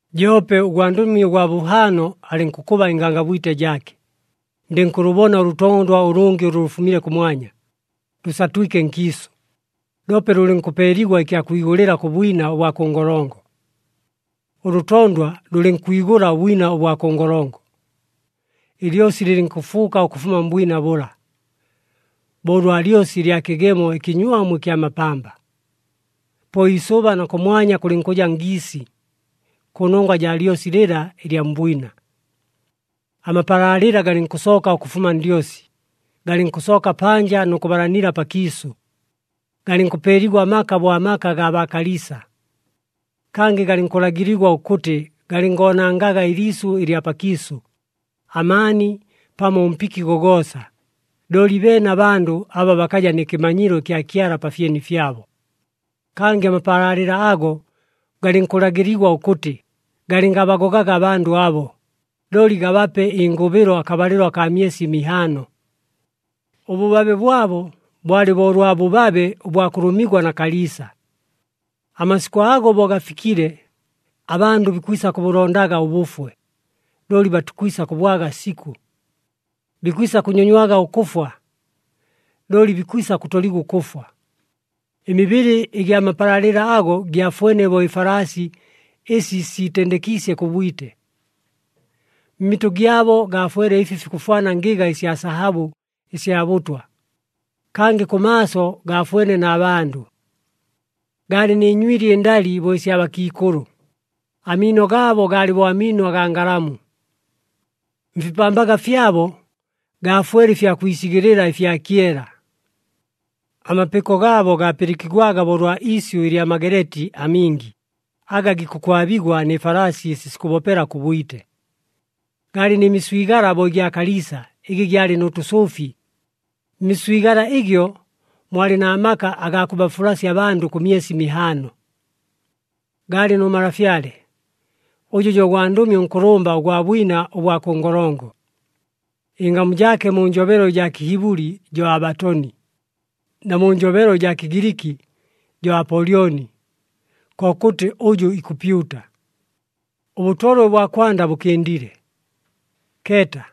Joope ʉgwandʉmi ʉgwa bʉhaano alɨnkʉkʉba ɨngangabwite jaake. Ndɨnkʉlʉbona ʉlʉtondwa ʉlʉngɨ ʉlʉ lʉfumile kʉmwanya, lʉsatwike nkiisʉ, loope lʉlɨnkʉpeeligwa ɨkya kwigʉlɨla kʉ bwina ʉbwa kʉ ngolongo. Ʉlʉtondwa lʉlɨnkwigʉla ʉbwina ʉbwa kʉ ngolongo, ɨlyosi lɨlɨnkʉfuuka ʉkʉfuma mbwina bʉla, bo ʉlwa lyosi ɨlya kɨgemo ɨkɨnywamu ɨkya mapamba. Po iisʉba na kʉmwanya kʉlɨnkʉja ngiisi kʉnongwa jaa lyosi lɨla ɨlya mbwina. Amapalaalɨla galɨnkʉsooka ʉkʉfuma ndyosi, galɨnkʉsooka panja nʉ kʉbalanila pakiisʉ, galɨnkʉpeeligwa amaka bo amaka agaa baakaliisa. Kangɨ galɨnkʉlagɨligwa ʉkʉtɨ galɨngoonangaga ɨliisʉ ɨlya pakiisʉ, amaani, pamo ʉmpiki gogoosa, looli beene abandʉ aba bakaja nɨ kɨmanyilo ɨkya Kyala pa fyeni fyabo. Kangɨ amapalaalɨla ago galɨnkʉlagɨligwa ʉkʉtɨ galɨngabagogaga abandʉ abo, looli gabape ɨngʉbɨlo akabalɨlo akaa myesi mihaano. Ʉbʉbabe bwabo bwalɨ bo ʉlwa bʉbabe ʉbwa kʉlʉmigwa na kaliisa. Amasikʉ ago bo gafikile, abandʉ bikwisa kʉbʉlondaga ʉbʉfwe, looli batikwisa kʉbwaga sikʉ. Bikwisa kʉnyonywaga ʉkʉfwa, looli bikwisa kʉtoligwa ʉkʉfwa. Ɨmibɨlɨ ɨgya mapalaalɨla ago gyafwene bo ɨfalaasi ɨsi siitendekiisye kʉ bwite. Mmitʉ gyabo gaafwele ɨfi fikʉfwana ngɨga ɨsya sahabʉ ɨsya bʉtwa. Kangɨ kʉmaaso gafwene na bandʉ. Gaalɨ nɨ nywili ɨndali bo ɨsya bakiikʉlʉ, amiino gaabo gaalɨ bo amiino agaa ngalamu. Mfipambaga fyabo gaafwele ɨfya kwisigɨlɨla ɨfya kyela. Amapɨko gaabo gaapɨlɨkigwaga bo ʉlwa iisyʉ ɨlya mageleeti amingi aga gikʉkwabigwa nɨ falaasi ɨsi sikʉbopela kʉ bwite. Gaalɨ nɨ miswigala bo ɨgya kaliisa ɨgɨ gyalɨ nʉ tʉsʉʉfi. Mmiswigala ɨgyo mwalɨ na maka agaa kʉbafulasya abandʉ kʉ myesi mihaano. Gaalɨ nʉ malafyale, ʉjʉ jo gwandʉmi ʉnkʉlʉmba ʉgwa bwina ʉbwa kʉ ngolongo, ɨngamu jaake mu njobelo ɨjaa Kɨhibʉli jo Abatoni, na mu njobelo ɨjaa Kɨgiliki jo Apolyoni, kokʉtɨ, “Ʉjʉ ikʉpyuta.” Ʉbʉtolwe ʉbwa kwanda bʉkɨndile. Keeta!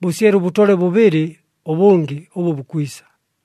Bʉsyele ʉbʉtolwe bʉbɨlɨ ʉbʉngɨ ʉbʉ bukwisa.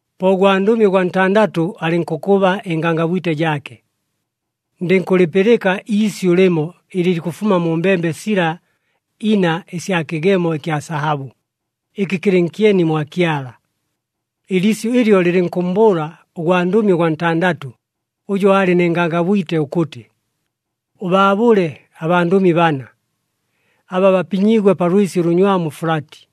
Po ʉgwandʉmi ʉgwa ntandatʉ alɨnkʉkʉba ɨngangabwite jaake. Ndɨnkʉlɨpɨlɨka iisyʉ lɨmo ɨlɨ likʉfuma mu mbembe sila ina ɨsya kɨgemo ɨkya sahabʉ, ɨkɨ kɨlɨ nkyeni mwa Kyala. Ɨliisyʉ ɨlyo lɨlɨnkʉmmbʉʉla ʉgwandʉmi ʉgwa ntandatʉ ʉjʉ aalɨ nɨ ngangabwite ʉkʉtɨ, “Ʉbaabʉle abandʉmi bana, aba bapinyiigwe pa lwɨsi ʉlʉnywamu Fulati.”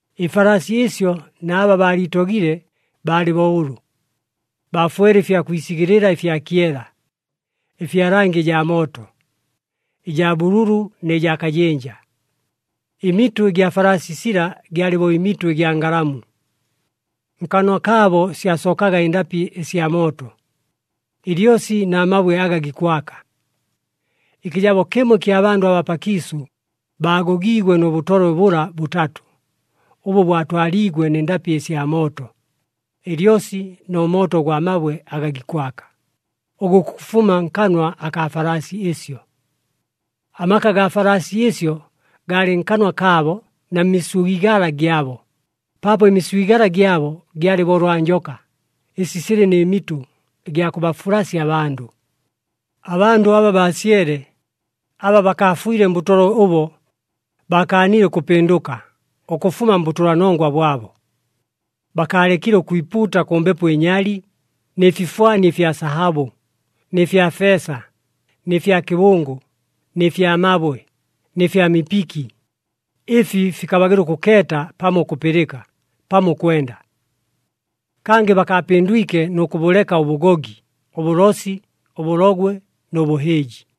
Ɨfalaasi ɨsyo na aba baaliitogile baalɨ bo ʉlʉ. Baafwele ɨfya kwisigɨlɨla ɨfya kyela, ɨfya langi ɨjaa mooto, ɨjaa bʉlʉlʉ nɨ jaa kajɨnja. Ɨmitʉ ɨgya falaasi sila gyalɨ bo ɨmitʉ ɨgya ngalamu. Nkanwa kaabo syasookaga ɨndapɨ ɨsya mooto, ɨlyosi na mabwe aga gikwaka. Ɨkɨjabo kɨmo ɨkya bandʉ abaa pakiisʉ, baagogiigwe nʉ bʉtolwe bʉla bʉtatʉ, ʉbʉ bwatwaliigwe nɨ ndapɨ ɨsya mooto, ɨlyosi nʉ mooto ʉgwa mabwe aga gikwaka, ʉgʉ gukʉfuma nkanwa akaa falaasi ɨsyo. Amaka gaa falaasi ɨsyo gaalɨ nkanwa kaabo na mmiswigala gyabo, paapo ɨmiswigala gyabo gyalɨ bo ʉlwa njoka, ɨsi silɨ nɨ mitʉ, ɨgya kʉbafulasya abandʉ. Abandʉ aba baasyele, aba bakaafwile mbʉtolwe ʉbo, baakaanile ʉkʉpɨndʉka ʉkʉfuma mbʉtʉlanongwa bwabo. Bakaalekile ʉkwipuuta kʉ mbepo ɨnyali, nɨ fifwani ɨfya sahabʉ, nɨ fya feesa, nɨ fya kɨbʉngʉ, nɨ fya mabwe, nɨ fya mipiki, ɨfi fikabagɨla ʉkʉkeeta pamo ʉkʉpɨlɨka pamo ʉkwenda. Kangɨ bakaapɨndwike nʉ kʉbʉleka ʉbʉgogi, ʉbʉlosi, ʉbʉlogwe nʉ bʉhɨɨji.